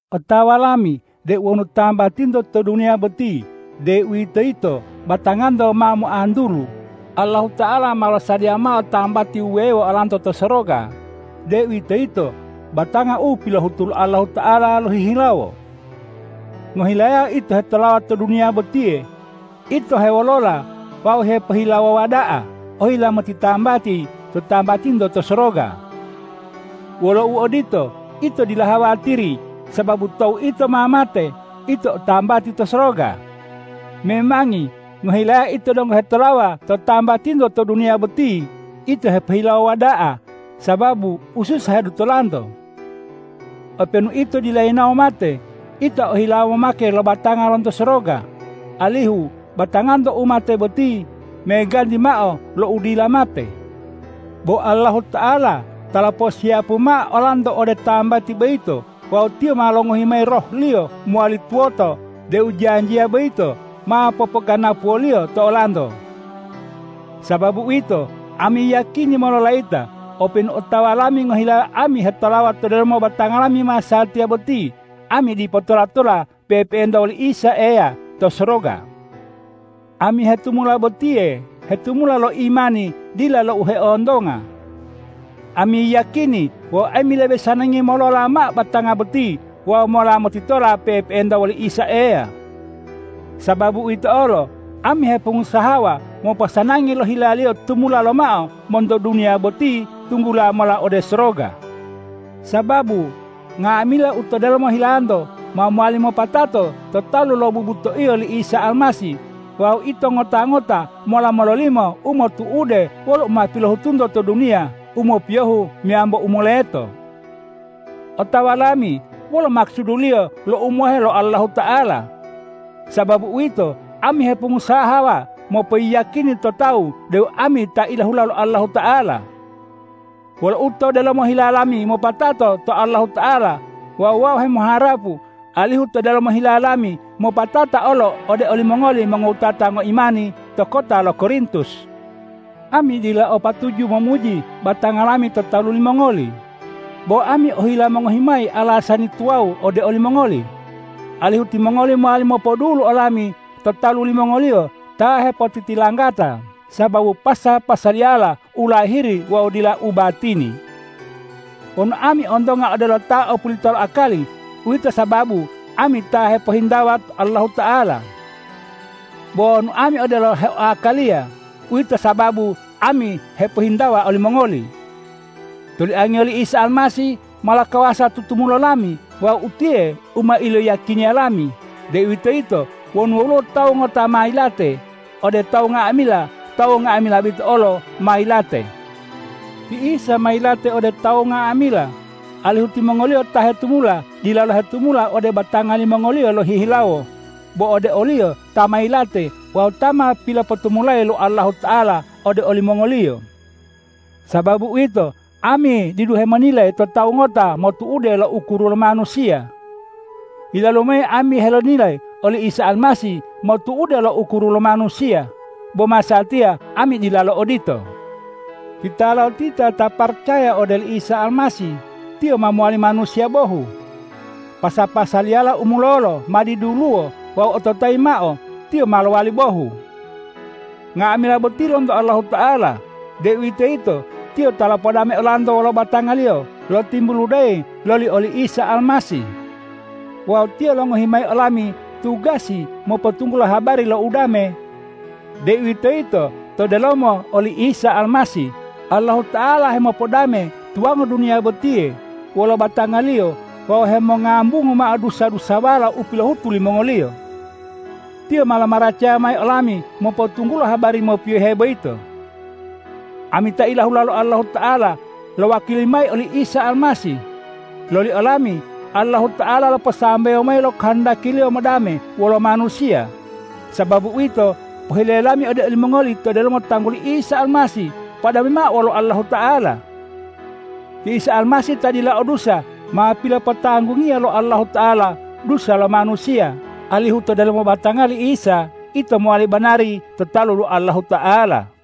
Otawa lami deu wonu tambatinto to duniya boti, deuwitoyito batanganto ma moantulu, Allahuta'ala ma losadiya mao tambati wuwewo olanto to soroga, deuwitoyito batanga u pilohutu lo Allahuta'ala lohihilawo. Ngohilayao ito hetolawa to duniya botiye, ito hewolola wawu hepohilawowa da'a ohila motitambati to tambatinto to soroga. Wolo uodito, ito dila hawatiri sababu tou ito ma mate, ito o tambati to soroga. Memangi ngohilayao ito donggo hetolawa to tambatinto to duniya boti, ito hepohilawowa da'a sababu ususa hedutolanto. Openu ito dila yinawo mate, ito ohilawo momake lo batanga lonto soroga, alihu batanganto u mate boti meganti mao lo u dila mate. Bo Allahuta'ala ta loposiyapu mao olanto ode tambati boyito wawu Tiyo ma longohi mayi Roh-Liyo mowali tuwoto deu janjiya boyito ma popoganapuwo-Liyo to olanto. Sababu uwito, ami yiyakini mololayita, openu otawa lami ngohilayao ami hetolawa to delomo batanga lami masatiya boti, ami dipo tola-tola pe'epe'enta woli Isa Eya to soroga. Ami hetumula botiye hetumula lo imani dila lo u heontonga. Ami yiyakini wawu ami lebe sanangi molola mao batanga boti wawu mola motitola pe'epe'enta woli Isa Eya. Sababu uwito olo, ami hepongusahawa moposanangi lo hila-Liyo tumula lomao monto duniya boti tunggula mola ode soroga. Sababu nga'amila u to delomo hilanto ma mowali mopatato to talu lo bubutoiyo li Isa Almasih wawu ito ngota-ngota mola mololimo u motu'ude wolo u ma pilohutunto to duniya, u mopiyohu meyambo u moleto. Otawa lami wolo makusuduliyo lo umohe lo Allahuta'ala. Sababu uwito, ami hepongusahawa mopoyiyakini to tawu deu ami ta ilahula lo Allahuta'ala. Wolo u to delomo hila lami mopatato to Allahuta'ala wawu wau hemoharapu alihu u to delomo hila lami mopatata olo ode olimongoli mongowutata ngoimani to kota lo Korintus. Ami dila o patuju momuji batanga lami to talu limongoli, bo ami ohila mongohi mayi alasani tuwawu ode olimongoli, alihu timongoli mowali mopodulu olami to talu limongoliyo ta hepotitilanggata sababu pasa-pasaliyala u lahiri wawu dila u batini. Wonu ami ontonga odelo ta opulita lo akali, uwito sababu ami ta hepohintawa Allahuta'ala. Bo wonu ami odelo ta heoakaliya, uwito sababu ami hepohintawa olimongoli. Toliangiyo li Isa Almasih ma lokawasa tutumulo lami wawu utiye u ma iloyiyakiniya lami, deuwitoyito wonu woluwo tawu ngota ta ma yilate ode tawu nga'amila, tawu nga'amila boyito olo ma yilate. Ti Isa ma yilate ode tawu nga'amila, alihu timongoliyo ta hetumula dilalo hetumula ode batanga limongoliyo lohihilawo, bo ode o-Liyo ta ma yilate wawu ta ma pilopotumulayi lo Allahuta'ala ode olimongoliyo. Sababu uwito, ami didu hemonilayi to tawu ngota motu'ude lo ukuru lo manusiya. Yilalu mayi ami helonilayi oli Isa Almasih motu'ude lo ukuru lo manusiya, bo masatiya ami dilalo odito. Titalotita ta ma paracaya ode oli Isa Almasih, tiyo ma lowali manusiya bohu. Pasa-pasaliyala u mulolo ma diduluwo wawu ototayi mao, tiyo ma lowali bohu. Nga'amila boti lonto Allahuta'ala, deuwitoyito Tiyo ta lopodame olanto wolo batanga-Liyo lotimbuludeyi loli oli Isa Almasih. Wawu Tiyo longohi mayi olami tugasi mopotunggulo habari lo udame, deuwitoyito to delomo oli Isa Almasih, Allahuta'ala hemopodame tuwango duniya botiye wolo batanga-Liyo wawu hemongambungu mao dusa-dusawala u pilohutu limongoliyo. Tiyo ma lomaracaya mayi olami mopotunggulo habari mopiyohe boyito. Ami ta ilahula lo Allahuta'ala lowakili mayi oli Isa Almasih. Loli olami Allahuta'ala loposambewo mayi lo kohondaki-Liyo modame wolo manusiya. Sababu uwito, pohile lami ode olimongoli to delomo tangguli Isa Almasih: Podame mao wolo Allahuta'ala! Ti Isa Almasih ta dila o dusa, ma pilopotanggungiya lo Allahuta'ala dusa lo manusiya, alihu to delomo batanga li Isa ito mowali banari to talu lo Allahuta'ala.